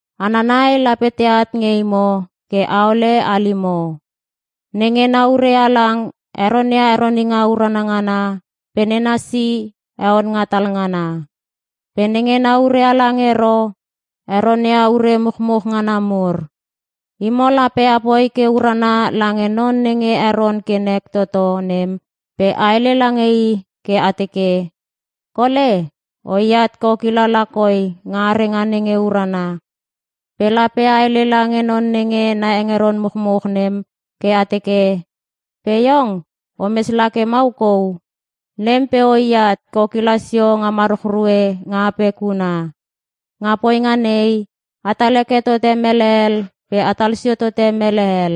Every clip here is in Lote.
Hana nai lape teat nge imo ke aole halimo. Nenge na ure halang heronia heroninga urana ngana pe nena si heon nga talngana. Pe nenge na ure halang ero heronia ure muchmuch ngana mur. Imo lape apoi ke urana lange non nenge heron ke nek toto nem pe a hele lange i ke a teke, “Kole, oi at ke o kila lakoi nga arenga nenge urana.” Pe lape a hele lange non nenge na hengeron muchmuch nem ke a teke, “Pe iong o mes la ke mau kou, nem pe oat ke o kila sio nga maruchrue nga apek huna.” Nga poinga nei, atal heke tote mele hel pe atal sio tote mele hel.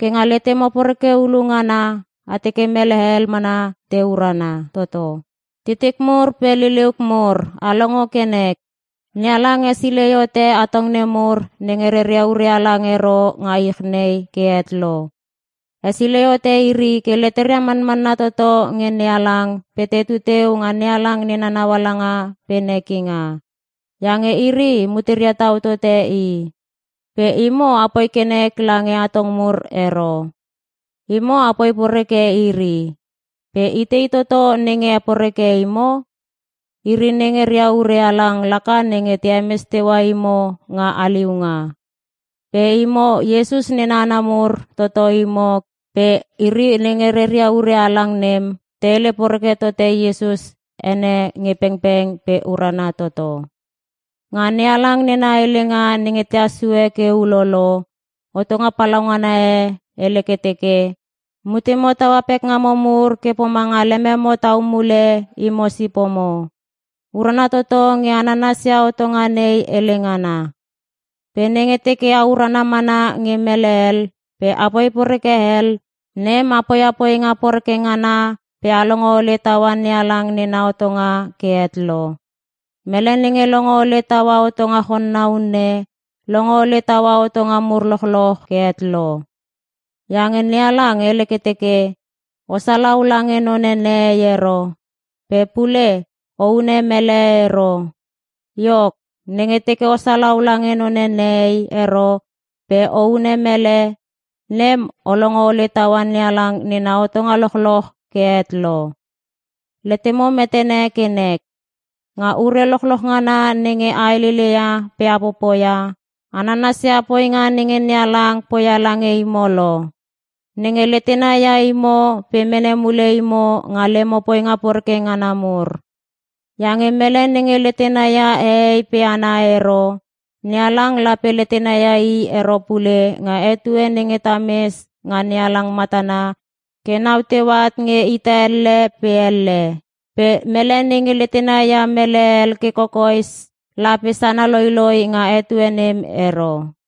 Ke nga letemo poreke hulu ngana a teke mele hel mana te urana toto. Titik mur pe liliuk mur a longo ke nek! NeHalang hesilei hote atong nemur nenge reria ure halang ero nga ich nei ke het lo. Hesilei hote iri ke leteria manmanna toto nge NeHalang pe tetu teu nga NeHalang nena naualanga pe nekinga. Iange iri muteria tau tote i. Pe imo apoi ke nek lange atong mur ero. Imo apoi poreke iri. Pe itei toto nenge heporeke imo? Iri nenge ria ure halang laka nenge te hemes teua imo nga haliunga. Pe imo, Iesus nena hana mur toto imo pe iri nenge reria ure halang nem te hele poreke tote Iesus ene nge pengpeng pe urana toto. Nga NeHalang nena helenga nenge tehas sue ke ulolo, hotonga palaungana e hele ke teke, “Mutemo taua pekngamo mur ke pomanga lememo tau mule imo sipomo.” Urana toto nge a nanasia hotonga nei hele ngana. Pe nenge teke a urana mana nge mele hel pe apoi poreke hel, nem a poia poinga poreke ngana pe a longo hole taua NeHalang nena hotonga ke het lo. Mele nenge longo hole taua hotonga chonna unne, longo hole taua hotonga mur lochloch ke het lo. Iange NeHalang hele ke teke, “O salau lange none nehei ero.” Pe pule, “O hune mele ero.” Iok, nenge teke o salau lange none nehei ero pe o hune mele, nem o longo hole taua NeHalang nena hotonga lochloch ke het lo. Letemo metene ke nek! Nga ure lochloch ngana nenge a heleleia pe a popoia, a nanasia poinga nenge NeHalang poia lange imo lo. Nenge letena ia imo pe mene mule imo nga lemo poinga poreke ngana mur. Iange mele nenge letena ia hehei pe hana ero, NeHalang lape letena ia i ero pule nga etue nenge ta mes nga NeHalang matana ke nau teu at nge ita elle pe elle. Pe mele nenge letena ia mele hel ke kokoes lape sana loiloi nga etue nem ero.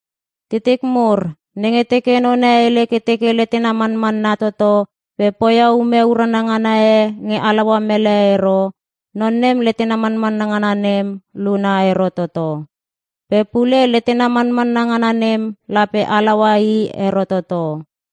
Titik mur, nenge teke none hele ke teke letena manmanna toto pe poia ume urana ngana e nge halaua mele ero, non nem letena manmanna ngana nem luna ero toto. Pe pule, letena manmanna ngana nem lape halaua i ero toto.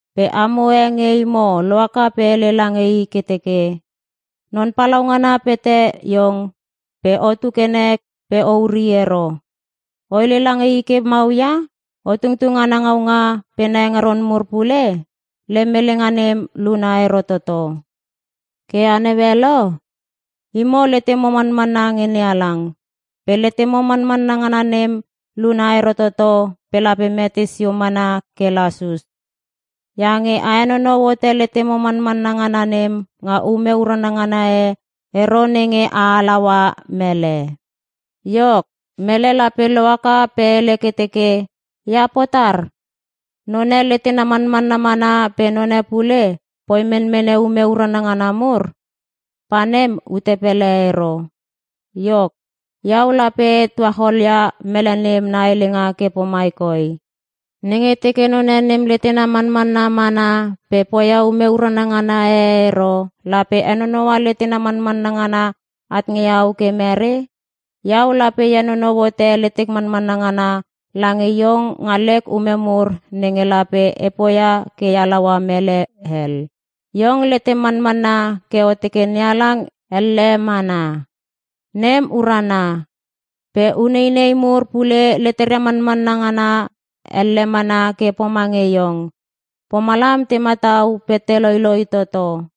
Pe amo e nge imo lohaka pe hele lange i ke teke, “Non Palaungana pete iong pe otu ke nek pe o uri ero.” O hele lange i ke mau ia? O tungtung ana ngaunga pe na hengeron mur pule? Lem helenga nem luna ero toto. Ke a naue lo? Imo letemo manmanna nge NeHalang. Pe letemo manmanna ngana nem luna ero toto pe lape mete sio mana ke lasus. Iange a henonou hote letemo manmanna ngana nem nga ume urana ngana e ero nenge a halaua mele. Iok, mele lape lohaka pe hele ke teke, “Ia potar? None letena manmanna mana pe none pule poi menmene ume urana ngana mur. Pa nem, ute pele ero.” Iok, iau lape e tuachol ia mele nem na helenga ke pomai koi, “Nenge teke none nem letena manmanna mana pe poia ume urana ngana e ero, lape henonoua letena manmanna ngana at nge iau ke mere? Iau lape e henonou hote letek manmanna ngana lange iong nga lek ume mur nenge lape e poia ke e halaua mele hel.” Iong letem manmanna ke o teke NeHalang elle mana. Nem urana! Pe uneinei mur pule leteria manmanna ngana elle mana ke pomange iong. Pomalam te matau pe te loiloi toto.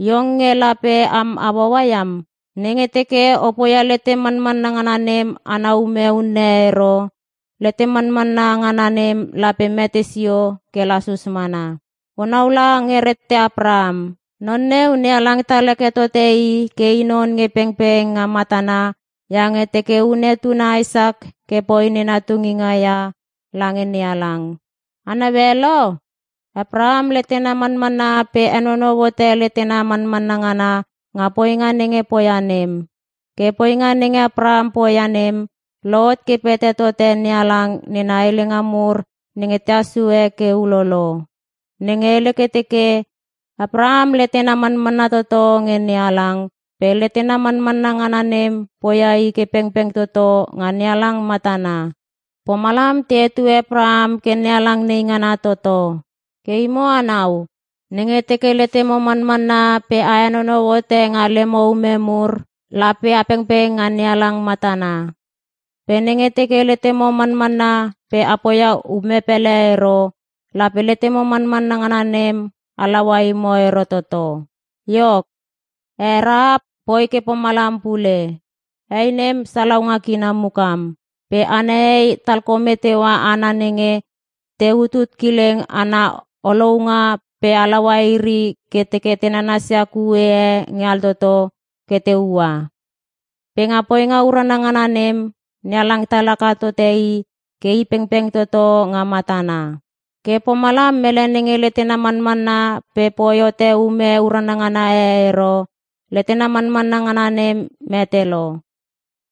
Iong nge lape am hauaua iam! Nenge teke o poia letem manmanna ngana nem ana ume unne ero, letem manmanna ngana nem lape mete sio ke lasus mana. O naula nge rette Apraham. Non neu, NeHalang tal heke tote i ke i non nge pengpeng nga matana iange teke hune tuna Isak ke poi nena tunginga ia lange NeHalang. A naue lo? Apraham letena manmanna pe henonou hote letena manmanna ngana nga poinga nenge poia nem. Ke poinga nenge Apraham poia nem, lohot ke pete tote NeHalang nena helenga mur nenge tehas sue ke ulolo, nenge hele ke teke, “Apraham letena manmanna toto nge NeHalang, pe letena manmanna ngana nem poia i ke pengpeng toto nga NeHalang matana.” Pomalam te hetue Apraham ke NeHalang neingana toto. Ke imo anau, nenge teke letemo manmanna pe a henonou hote nga lemo ume mur, lape a pengpeng nga NeHalang matana. Pe nenge teke letemo manmanna pe a poia ume pele ero, lape letemo manmanna ngana nem halaua imo ero toto. Iok he Rahap poi ke pomalam pule. Hei nem, salaunga kina mukam. Pe ana hei, talkome teua hana nenge te utut kileng ana olounga pe halaua iri ke te nanasia kue e nge altoto ke te ua. Pe nga poinga urana ngana nem, NeHalang tal haka tote i ke i pengpeng toto nga matana. Ke pomalam mele nenge letena manmanna pe poi hote ume urana ngana e ero, letena manmanna ngana nem mete lo.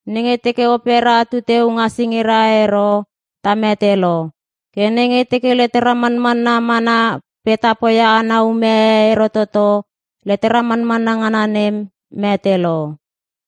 Nenge teke opera tu teu nga singira ero, ta mete lo. Ke nenge teke letera manmanna mana pe ta poia ana ume e ero toto, letera manmanna ngana nem mete lo.